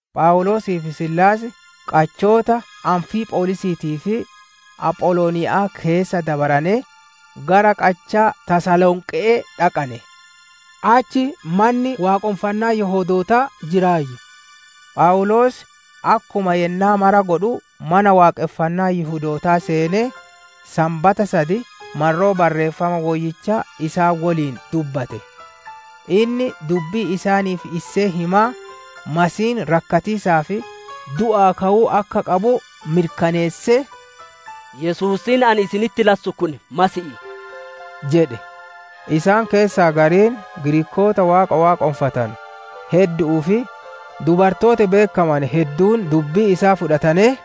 Phawuloosii fi siilaas qachoota Amfiipholiisiitii fi Apholoniya'aa keessa dabaranee, gara qachaa Tasalonqe'ee dhaqane; achi manni waaqonfannaa Yihudootaa jiraayyu. Phawuloos akkuma yennaa mara godhu mana waaqonfannaa Yihudootaa seenee, Sanbata sad marroo Barreeffama Woyyichaa isaan woliin dubbate; inni dubbii isaaniif issee himaa Masiihiin rakkatiisaa fi du'aa ka'uu akka qabu mirkaneessee, «Yesuusiin ani isinitti lassu kun Masiihii» jedhe. Isaan keessaa gariin, Giriikoota Waaqa waaqonfatanu heddu'uu fi dubartooti beekkamane hedduun dubbii isaa fudhatanee,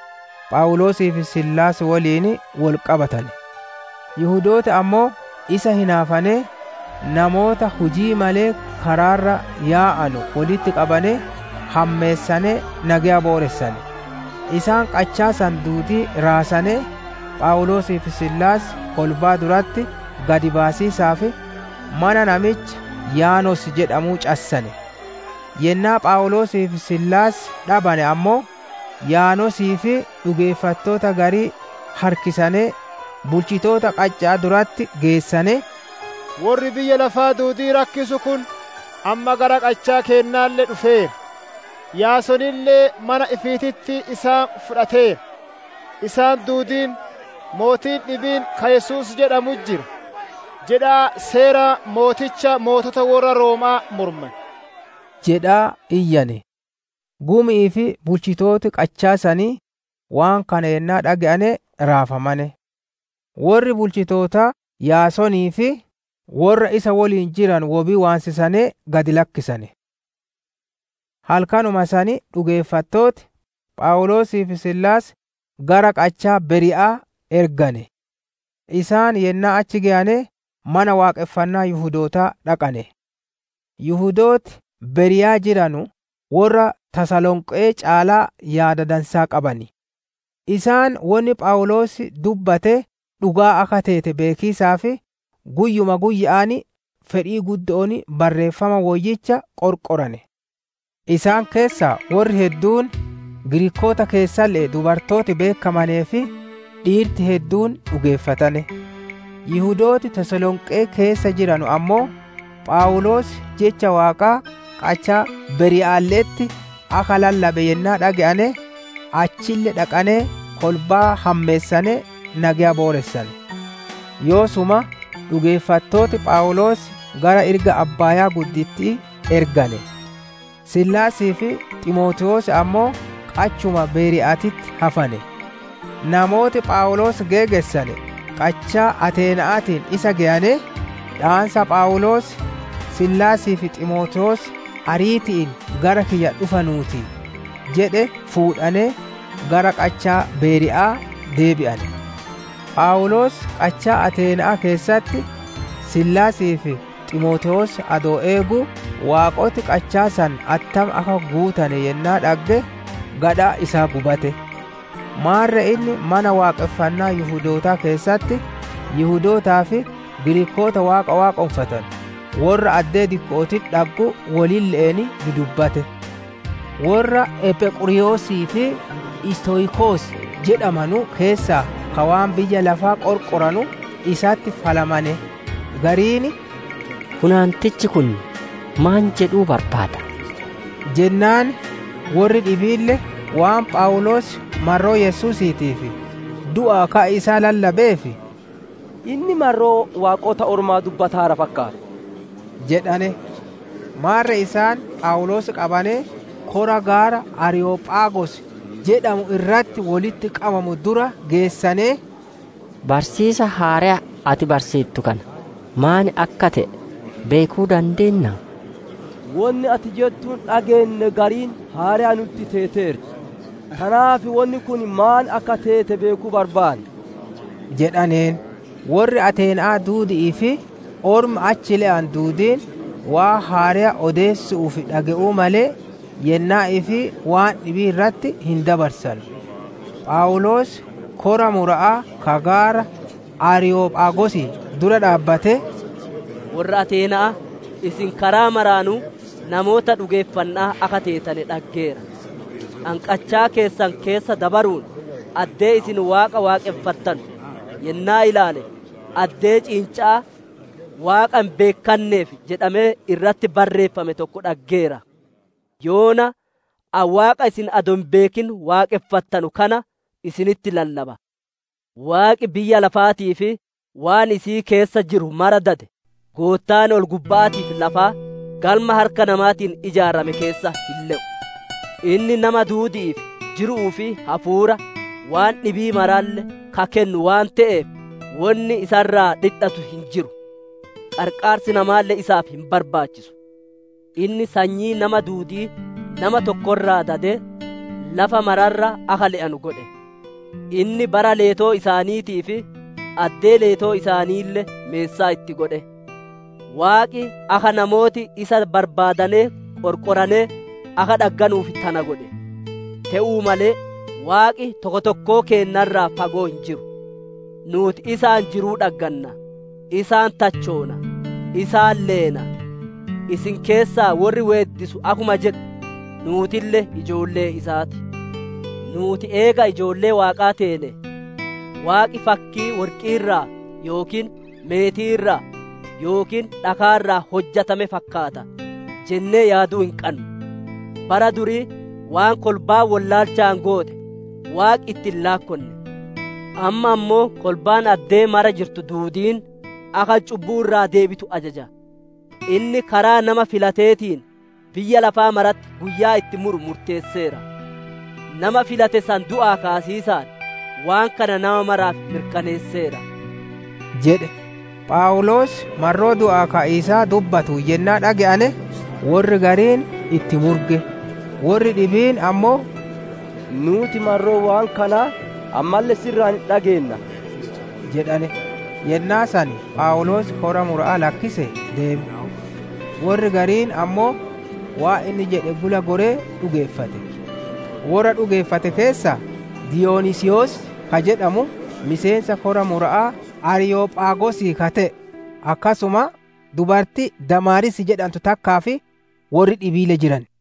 Phawuloosii fi Siilaas woliin wol qabatane. Yihudooti ammoo isa hinaafanee, namoota hujii malee karaa irra yaa'anu wolitti qabanee, hammeessanee, nageya booressane; isaan qachaa san duudii raasanee, Phawuloosii fi Siilaas kolbaa duratti gad baasiisaaf mana namicha Yaason jedhamuu cassane. Yennaa Phawuloosii fi Siilaas dhabane ammoo, Yaasonii fi dhugeeffattoota garii harkisanee, bulchitoota qacha'aa duratti geessanee, «Worri biyya lafaa duudii rakkise kun, amma gara qachaa keennaalle dhufeera. Yaasonille mana ifiititti isaan fudhateera; isaan duudiin, ‹Mootiin dhibiin ka Yesuus jedhamu jira› jedhaa, seera mooticha mootota worra Rooma'aa morman» jedhaa iyyane. Gumi'ii fi bulchitooti qachaa sanii waan kana yennaa dhage'ane raafamane. Worri bulchitootaa Yaasonii fi worra isa woliin jiranu wobii waansisanee gad lakkisane. Halkanuma san dhugeeffattooti, Phawuloosii fi Siilaas gara qachaa Beeriya'aa ergane. Isaan yennaa achi geyane mana waaqonfannaa Yihudootaa dhaqane. Yihudooti Berii'a jiranu worra Tasalonqe'ee caalaa yaada dansaa qaban. Isaan wonni Phawuloos dubbate dhugaa akka teete beekiisaaf, guyyuma guyya'aan fedhii guddo'oon Barreeffama Woyyicha qorqorane. Isaan keessaa worri hedduun, Giriikoota keessalle'ee dubartooti beekkamanee fi dhiirti hedduun dhugeeffatane. Yihudooti Tasalonqee keessa jiranu ammoo, Phawuloos Jecha Waaqaa qachaa Beriya'aalle'etti akka lallabe yennaa dhage'ane, achille dhaqanee kolbaa hammeessanee nageya booressane. Yoosuma dhugeeffattooti Phawuloos gara irga abbaaya'aa ergane; Siilaasii fi Ximootewoos ammoo qachuma Beriya'aatitti hafane. Namooti Phawuloos geegessane qachaa Ateena'aatiin isa geyanee, dhaansa Phawuloos, «Siilaasii fi Ximootewoos ariiti'iin gara kiyya dhufanuu ti» jedhe fuudhanee gara qachaa Beeriya'aa deebi'ane. Phawuloos qachaa Ateena'aa keessatti Siilaasii fi Ximootewoos adoo eeguu waaqoti qachaa san attam akka guutane yennaa dhagge, gadhaan isaa gubate. Maarre inni Mana Waaqonfannaa Yihudootaa keessatti Yihudootaa fi Giriikoota Waaqa waaqonfatanu, worra addee dikko'ootitti dhaggu wolille'een dudubbate. Worra Ephequriyoosii fi Istoyikos jedhamanu keessaa ka waan biyya lafaa qorqoranu isatti falmane; gariin, «Funaantichi kun maan jedhuu barbaada?» jennaan, Worri dhibiille waan Phawuloos marroo Yesuusiitii fi du'aa ka'a isaa lallabeef, «Inni marroo waaqota ormaa dubbataara fakkaata» jedhane. Maarre isaan Phawuloos qabanee kora gaara Aariyophaagos jedhamuu irratti wolitti qabamu dura geessanee, «Barsiisa haareya ati barsiittu kana maan akka te'e beekuu dandeennaa? Wonni ati jettuun dhageenne gariin haareya nutti teeteerti. Tanaaf wonni kun maan akka teete beekuu barbaanna» jedhaneen. Worri Ateena'aa duudi'ii fi ormi achi le'u duudiin waan haareya odeessu'uu fi dhage'uu malee, yennaa ifii waan dhibii irratti hin dabarsanu. Phawuloos kora mura'aa ka gaara Aariyophaagosii dura dhaabbatee, «Worra Ateena'aa, isin karaa maraanuu namoota dhugeeffanna'aa akka teetane dhaggeera. Ani qachaa keessan keessa dabaruun, addee isin Waaqa waaqonfattanu yennaa ilaale, addee ciinca'aa ‹Waaqa hin beekkanneef› jedhamee irratti barreeffame tokko dhaggeera. Yoona ani Waaqa isin adoo hin beekin waaqonfattanu kana, isinitti lallaba. Waaqi biyya lafaatii fi waan isii keessa jiru mara dade, Goottaan ol-gubba'aatii fi lafaa, galma harka namaatiin ijaarame keessa hin le'u. Inni nama duudi'iif jiru'uu fi hafuura, waan dhibii maralle ka kennu waan te'eef, wonni isa irraa dhidhatu hin jiru; qarqaarsi namaalle isaaf hin barbaachisu. Inni sanyii namaa duudii nama tokko irraa dadee, lafa mara irra akka le'anu godhe; inni bara leetoo isaaniitii fi addee leetoo isaaniille meessaa itti godhe. Waaqi akka namooti isa barbaadanee qorqoranee, akka dhagganuuf tana godhe. Te'uu malee Waaqi tokko tokkoo keenna irraa fagoo hin jiru. Nuuti isaan jiruu dhagganna; isaan tachoona; isaan leena. Isin keessaa worri weeddisu akkuma jedhu, ‹Nuutille ijoollee isaa ti›. «Nuuti eega ijoollee Waaqaa teene ‹Waaqi fakkii worqii irraa yookiin meetii irraa yookiin dhakaa irraa hojjatame fakkaata› jennee yaaduu hin qannu. Bara durii waan kolbaan wollaalchaan goote, Waaqi itti hin laakkonne; amma ammoo kolbaan addee mara jirtu duudiin, akka cubbuu irraa deebitu ajaja. Inni karaa nama filateetiin, biyya lafaa maratti guyyaa itti muru murteesseera; nama filate san du'aa kaasiisaan, waan kana nama maraaf mirkaneesseera» jedhe. Phawuloos marroo du'aa ka'iisaa dubbatuun yennaa dhage'ane, worri gariin itti murge; worri dhibiin ammoo, «Nuuti marroo waan kanaa ammalle si irraa hin dhageenna» jedhane. Yennaa san Phawuloos kora mura'aa lakkisee deeme. Worri gariin ammoo waan inni jedhe gula goree dhugeeffate. Worra dhugeeffate keessaa Diiyoniisiyos ka jedhamu miseensa kora mura'aa Aariyophaagosii ka te'e, akkasuma dubartii Damaariis jedhantu takkaa fi worri dhibiille jiran.